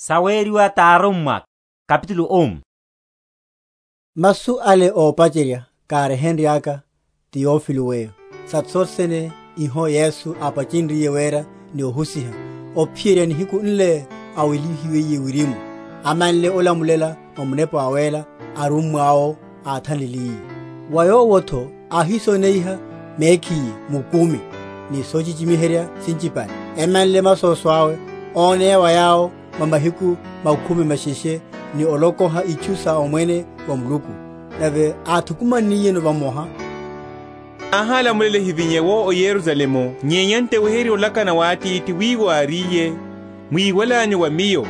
Owela wa Yesu oya wirimu. Masu ale ópacherya káryehenryaka, Teofilo weyo, sa sothe sene iho Yesu ápachenryiye wera ni ohusiha, ophiyerya nihiku nle áwelihiwiye wirimu, amanle olamulela mwa Munepa Wawéla arummwa’wo áthanliliye: wa yawo’tho áhísoneiha mekhiye mukumi ni sochichimiherya sinchipale, emanle masoso awe, óneya wa yawo mwa mahiku makhumi masheshe, ni olokoha itchu sa omwene wa Muluku: nave áthukumanniyeno vamoha, áhálamulela ehivinye’wo o Yerusalemu, nyenya nto eweherye olakana wa Atithi, wiwo, áriye, mwíwalanyu wa Miyo;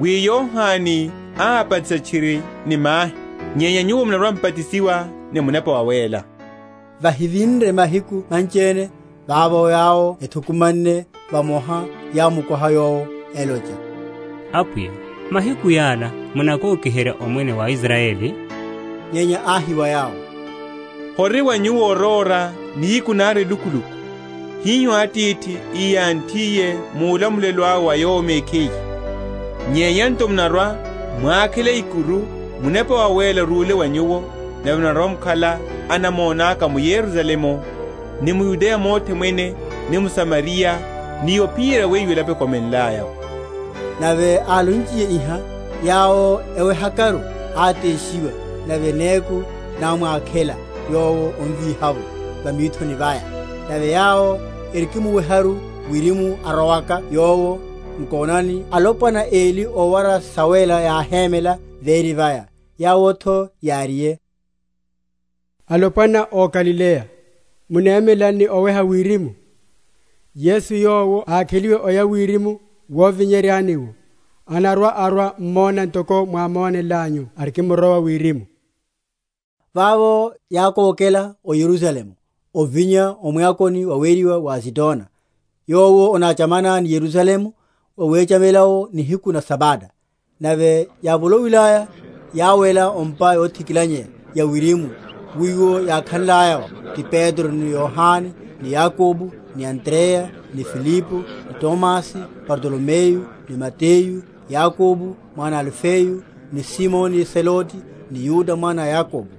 wi Yohane ábatisa tchiri ni mahi; nyenya nyuwo munarwa‐m’batisiwa ni Munepa Wawéla, vahivinre mahiku manchiene. Vavo, yawo ethukumanne vamoha, yámukoha Yowo, elocha, Apwiya, mahiku yala munakokiherya omwene wa Israyeli? Nyenya áhi wa yawo, Hori wa nyuwo oróra nihiku nari elukuluku, hiho Atithi íyanthiye mu’lamulelo awe wa Yowo mekhiye. Nyenya nto munarwa‐mwakhela ikuru, Munepa Wawéla arúle wa nyuwo: nave munarwa‐mukhala anamona’ka m’Yerusalemu, ni m’Yudeya mothe mwene, ni m’Samariya, ni ophiyerya wiwo elapo ekomenlaya’wo. Nave álonchiye iha, yawo ewehakaru, áteshiwa; nave neku námwakhela Yowo omvíha’vo va mithoni vaya. Nave yawo erikimuweharu wirimu arowaka Yowo, nkonani, alopwana eli ówara sawéla yáhémela véri vaya; yawo’tho yáriye, Alopwana ó Galileya, munemelelani ni oweha wirimu? Yesu yowo, ákheliwe oya wirimu wovi?-?nyeryani’wo, anarwa‐arwa mummo ntoko mwámonnanyu arikimrowa wirimu. Vavo yákókela o Yerusalemu ovinya o mwakoni waweriwa wa Azitona, yowo onachamana ni Yerusalemu, wawechela’wo nihiku na Sabata. Nave yávoloiyaya yáwela o’mpa yothikilanya ya wirimu, wiwo yákhalaya’wo; ti Petro ni Yohane ni Yakobo ni Andreya, Filipo ni Tomasi, Bartolomeyu ni Mateyu, Yakobo mwana a Alifeyu, ni Simoni Zelote, ni Yuda mwana a Yakobo.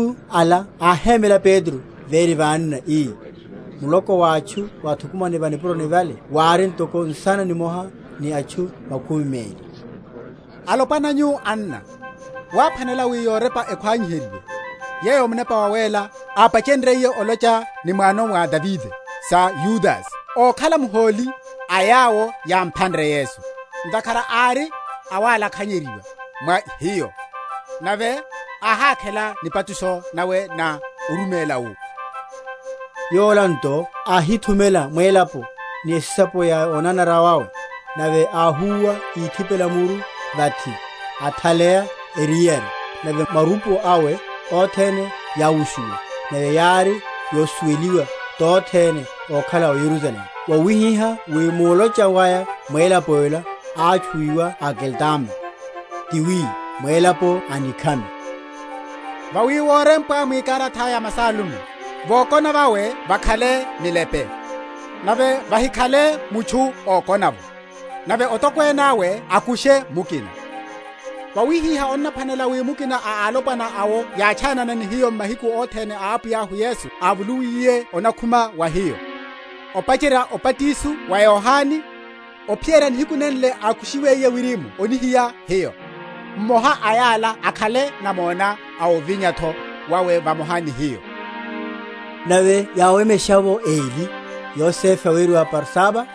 Nave m’mahiku ala áhémela Petro véri va anna, ii (muloko wa atchu wáthukumanne va nipuroni vale wári ntoko nsana nimoha ni atchu makhumi meli), Alopwana nyu, anna, wáphwanela wi yorepa ekhwani?-?heryiwe, yeyo Munepa Wawéla, ápachenryiye olocha ni muwano mwa Davide sa Yudase, ókhala muholi a yawo yámphanre Yesu. Ntakhara ári awalakhanyeryiwa mwa hiyo, nave áhákhela nipatusho nawe na orumela wu. (Yola nto áhithumela mwélapo ni esisapo ya onanara wawe; nave áhúwa íthipela muru vathi, athaleya eriyari, nave marupo awe othene yáwushuwa; nave yári yosuweliwa tothene ókhala o Yerusalemu; wawihiha wi mulocha waya mwélapo’la átchuwiwa Akeldama, tiwi, mwélapo a nikhami.) Vawi worempwa mwikarata ya Masalmo, Vokona vawe vakhale milepe, Nave vahikhale mutchu ókona’vo; Nave otokwene awe akushe mukina. Vawihiha onnaphwanela wi mukina a alopwana awo yátchanana ni hiyo mahiku othene awo Apwiya Yesu ávolowiye anakhuma va hiyo, opacherya obatiso wa Yohane, ophiyerya nihiku nenle ákushiwiye wirimu onihiya hiyo, mmoha a yala akhale namona a ovinya’tho wawe vamoha ni hiyo. Nave yáwemesha’vo eli, Yosefe aweriwa Barsaba,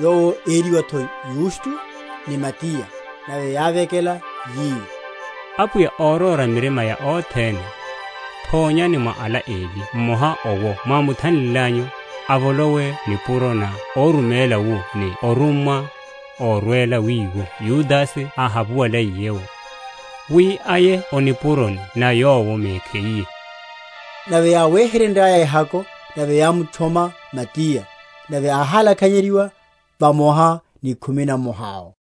yowo ériwa’tho Yusto, ni Matiya. Nave yávekela, yi, Apwiya, óróra mirima ya othene, thonyani mwa ala eli mmoha owo mwámuthanlilanyu, avolowe nipuro na oruméla wu ni orummwa, orwela wiwo Yudase áhapuwaliye’wo, wi aye o nipuroni na yowo mekhiye. Nave yáwéhererya ehako; nave yámutchoma Matiya; nave áhálakhanyeryiwa vamoha ni khumi na mmoha’wo.